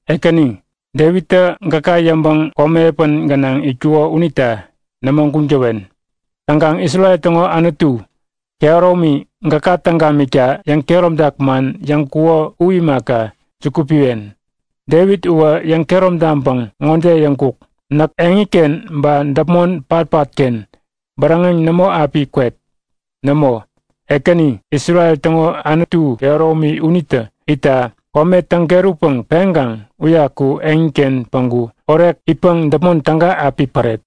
Ekäni, Devittä gäka yäŋpäŋ komi epän gänaŋ itkuko unita nämo guŋ täwen. Täŋkaŋ Isrel täŋo Anutu kehäromi gäka täŋ gamikta yäŋkehäromtak man yäŋkuko u imaka, juku piwen. Devit uwä yäŋkehärom taŋpäŋ ŋode yäŋkuk; Näk eŋiken ba däpmon patpatken bäräŋeŋ nämo api kwet. Nämo, Ekäni, Isrel täŋo Anutu kehäromi unitä itta kome täŋ-kerutpäŋ peŋkaŋ uyaku eŋiken päŋku orek itpäŋ däpmon täga api päret.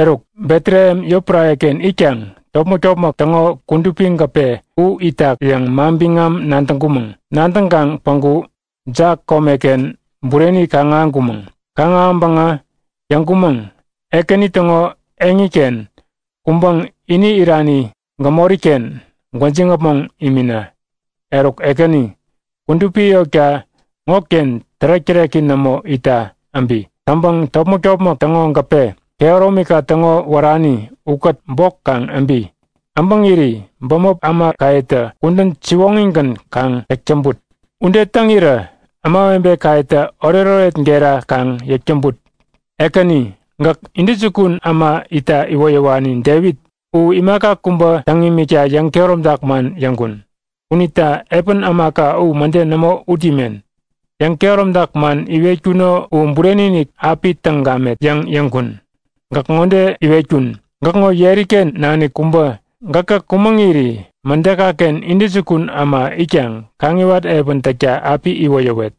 Eruk, Betlehem yotpärareken itkaŋ topmäk-topmäk täŋo kudupi gäpe u itak yäŋ manbiŋam nadäŋkumäŋ. Nadäŋkaŋ päŋku Ja komeken bureni kaŋ-ahäŋkumäŋ. Kaŋ-ahäŋpäŋä yäŋkumäŋ; Ekäni täŋo eŋiken kuŋpäŋ ini irani gämoriken gwäjiŋ-äpmoŋ imina! Eruk Ekäni, kudupi yotka ŋoken tärek-täreki nämo itta äbi! Täŋpäŋ topmäk-topmäk täŋo gäpe, kehäromika täŋo wärani, ukät bok kaŋ äbi! Äbäŋiri bämop ämakayetä kudän siwoŋigän kaŋ täk täŋput. Ude täŋirä ämawebekayetä oretoret gera kaŋ yäk täŋput. Ekäni, gäk intäjukun äma itta iwoyäwani Devit u imaka kubä täŋ imikta yäŋkehäromtak man yäŋkun. Unita epän ämaka u mäde nämo ut imen. Yäŋ-kehäromtak man iwetkuno u bureni-inik api täŋ gamet yäŋ yäŋkun. Gäk ŋode iwetkun; Gäkŋo yeriken nanik kubä gäkä kumäŋiri mädekaken intäjukun äma itkaŋ kaŋiwat epän täkta api iwoyäwet.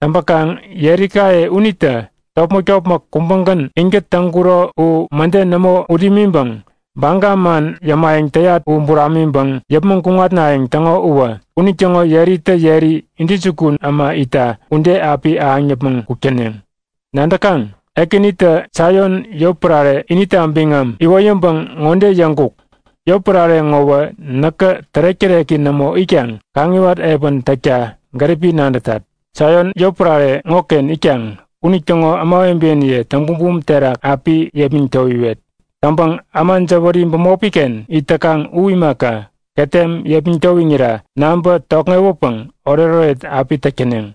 Täŋpäkaŋ yerikaye unitä topmäk-topmäk kubägän inkät täŋkuro u mäde nämo ut imiŋpäŋ baga man yämayäŋ täyat u buramiŋpäŋ yäpmäŋ kuŋatnayäŋ täŋo uwä, unitäŋo yeritä yeri intäjukun äma itta ude api ahäŋ yäpmäŋ kuk täneŋ. Nadäkaŋ? Ekänitä Saion yotpärare inita biŋam iwoyäŋpäŋ ŋode yäŋkuk; Yotpärare ŋowä näkä tärek-täreki nämo itkaŋ kaŋiwat epän täkta gäripi nadätat. Saion yotpärare ŋoken itkaŋ unitäŋo ämawebeniye täŋ-bumbum terak api yepmäŋ towiwet. Täŋpäŋ äma jäwäri bämopiken it täkaŋ u imaka, ketem yepmäŋ towiŋira naŋpä tokŋewäpäŋ oretoret api täk täneŋ.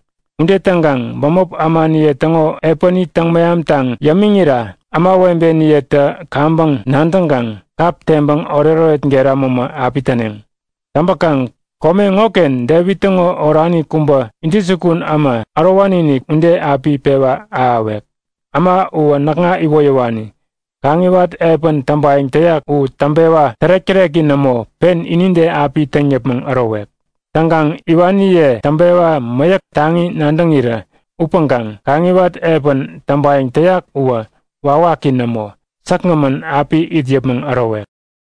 Ude täŋkaŋ bämop ämaniye täŋo epäni täŋ-mehamtaŋ yämiŋira ämawebeniyetä kaŋpäŋ nadäŋkaŋ kap teŋpäŋ oretoret gera mämä api täneŋ. Täŋpäkaŋ kome ŋoken Devit täŋo orani kubä intäjukun äma ärowani-inik ude api pewa ahäwek. Äma uwä näkŋa iwoyäwani. Kaŋiwat epän täŋpayäŋ täyak u täŋpewa tärek-täreki nämo pen inide api täŋ yäpmäŋ ärowek. Täŋkaŋ iwaniye täŋpewa mäyäk taŋi nadäŋirä upäŋkaŋ kaŋiwat epän täŋpayäŋ täyak uwä wawaki nämo, säkgämän api it yäpmäŋ ärowek.